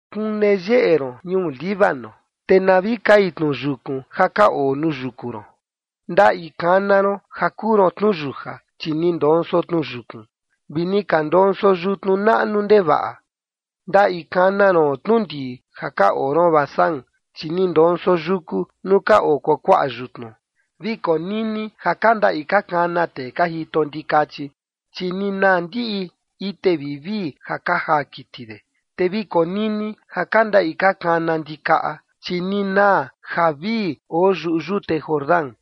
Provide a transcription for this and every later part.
Kune yeꞌe ron ñuu Líbano, te na vi kai tnu yukun ja ka oo nuu yuku ron. Ndaꞌi kana ron ja kuu ron tnuyuja, chi ni ndonso tnu yukun vi ni ka ndonso yutnu naꞌnu ndevaꞌa. Ndaꞌi kana ron tnundii ja ka oo ron Basán, chi ni ndonso yuku nuu ka oo kuakuaꞌa yutnu. Vi konini ja ka ndaꞌi ka kana tee ka jito ndikachi, chi ni naa ndiꞌi ite vivii ja ka jaa kiti de, te vi konini ja ka ndaꞌi ka kana ndikaꞌa, chi ni naa javii oo yuꞌu yute Jordán.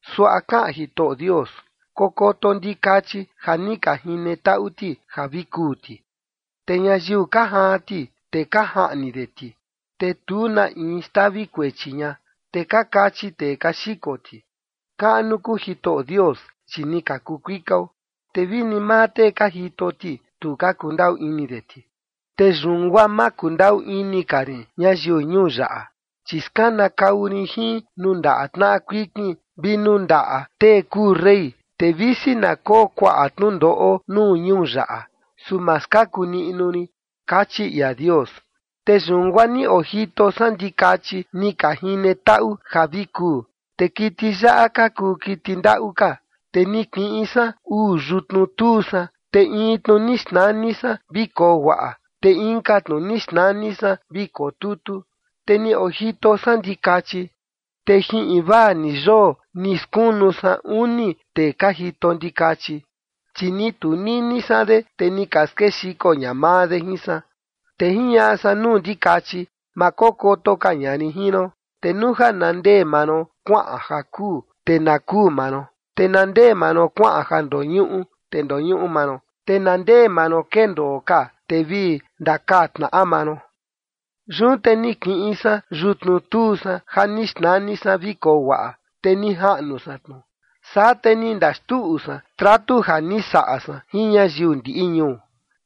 Suaꞌa kaꞌan Jitoꞌo Dios: “Kokoto ndikachi ja ni ka jine taꞌu ti ja vi kuu ti. Te ñayiu ka jaan ti, te ka jaꞌni de ti, te tu na in xtavi kuechi ña, te ka kachi tee ka xiko ti: Kaꞌnu kuu Jitoꞌo Dios, chi ni ka kuu kuikao. Te vini maa tee ka jito ti, tu ka kundaꞌu ini de ti. Te yun guaa ma kundaꞌu ini ka rin ñayiu ñuu yaꞌa, chi skanakau rin jin nuu ndaꞌa tnaꞌa kuikin vi nuu ndaꞌa tee kuu rey, te visi na koo kuaꞌa tnundoꞌo nuu ñuu yaꞌa, su ma skaku niꞌnu rin”, kachi ia Dios. Te yun guaa ni ojito san ndikachi ni ka jine taꞌu ja vi kuu, te kiti yaꞌa ka kuu kiti ndaꞌu ka. Te ni kiꞌin san uu yutnu tuu san, te in tnu ni xnani san “vi koo guaꞌa”, te inka tnu ni xnani san “vi koo tutu”, te ni ojito san ndikachi. Te jin invaa ni yoo ni skunu san uni tee ka jito ndikachi, chi ni tunini san de, te ni ka skexiko ña maa de jin san. Te jiñaꞌa san nuu ndikachi: “Ma kokoto ka ña rin jin ron, te nuu ja na ndee maa ron kuaꞌan ja kuu, te na kuu maa ron. Te na ndee maa ron kuaꞌan ja ndoñuꞌu, te ndoñuꞌu maa ron. Te na ndee maa ron kendoo ka, te vi ndakaa tnaꞌa maa ron.” Yun te ni kiꞌin san yutnu tuu san ja ni xnani san “vi koo guaꞌa” te ni jaꞌnu san tnu. Saa te ni ndaxtuꞌu san tratu ja ni saꞌa san jin ñayiu ndiꞌi ñuu.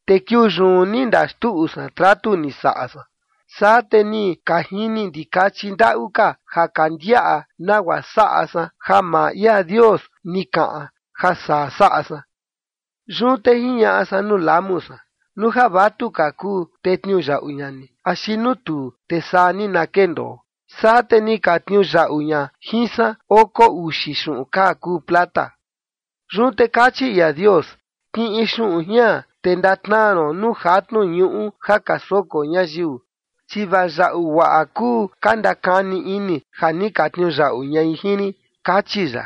Te kiuu yun ni ndaxtuꞌu san tratu ni saꞌa san, saa te ni ka jini ndikachi ndaꞌu ka ja ka ndiaꞌa nagua saꞌa san ja maa ia Dios ni kaꞌan ja saa saꞌa san. Yun te jiñaꞌa san nuu lamu san: “Nuu ja vatuka kuu, te tniuyaꞌu ña ni, axi nuu tuu, te saa ni na kendoo”. Saa te ni ka tniuyaꞌu ña jin san oko uxi xuꞌun kaa kuu plata. Yun te kachi ia Dios: “Kiꞌin xuꞌun jian, te ndatnaa ron nuu jatnu ñuꞌu ja ka soko ñayiu, chi vaa yaꞌu guaꞌa kuu ka ndakani ini ja ni ka tniuyaꞌu ñai jin rin”, kachi ya.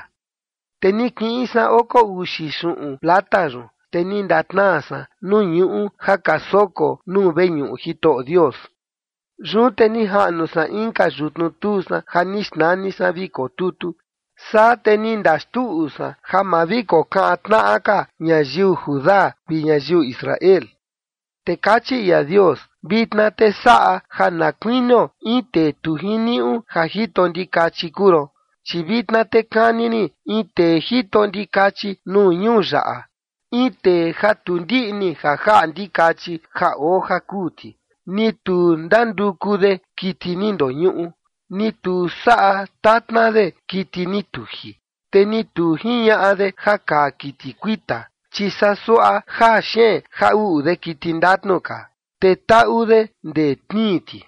Te ni kiꞌin san oko uxi xuꞌun plata yun, te ni ndatnaa san nuu ñuꞌu ja ka soko nuu veñuꞌu Jitoꞌo Dios. Yun te ni jaꞌnu san inka yutnu tuu san ja ni xnani san “vi koo tutu”. Saa te ni ndaxtuꞌu san ja ma vi kokaꞌan tnaꞌa ka ñayiu Judá vi ñayiu Israel. Te kachi ia Dios: “Vitna te saꞌa ja na kuinio in tee tu jiniuꞌu ja jito ndikachi kuu ron, chi vitna te kani rin in tee jito ndikachi nuu ñuu yaꞌa, in tee ja tu ndiꞌni ja jaꞌa ndikachi ja oo ja kuu ti, ni tu ndanduku de kiti ni ndoñuꞌu, ni tu saꞌa tatna de kiti ni tuji, te ni tu jiñaꞌa de ja kaa kiti kuita, chi saa suaꞌa jaa xeen jaa uꞌu de kiti ndatnu ka, te taꞌu de ndee tnii ti.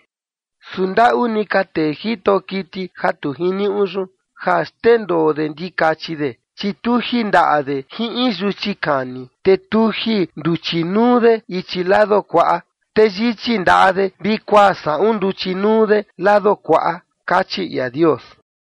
Su ndaꞌu ni ka tee jito kiti ja tu jiniuꞌu yun, ja xndendoo de ndikachi de, chi tuji ndaꞌa de jin in yuchi kani, te tuji nduchi nuu de ichi lado kuaꞌa, te yichi ndaꞌa de vi kuaa saꞌun nduchi nuu de lado kuaꞌa”, kachi ia Dios.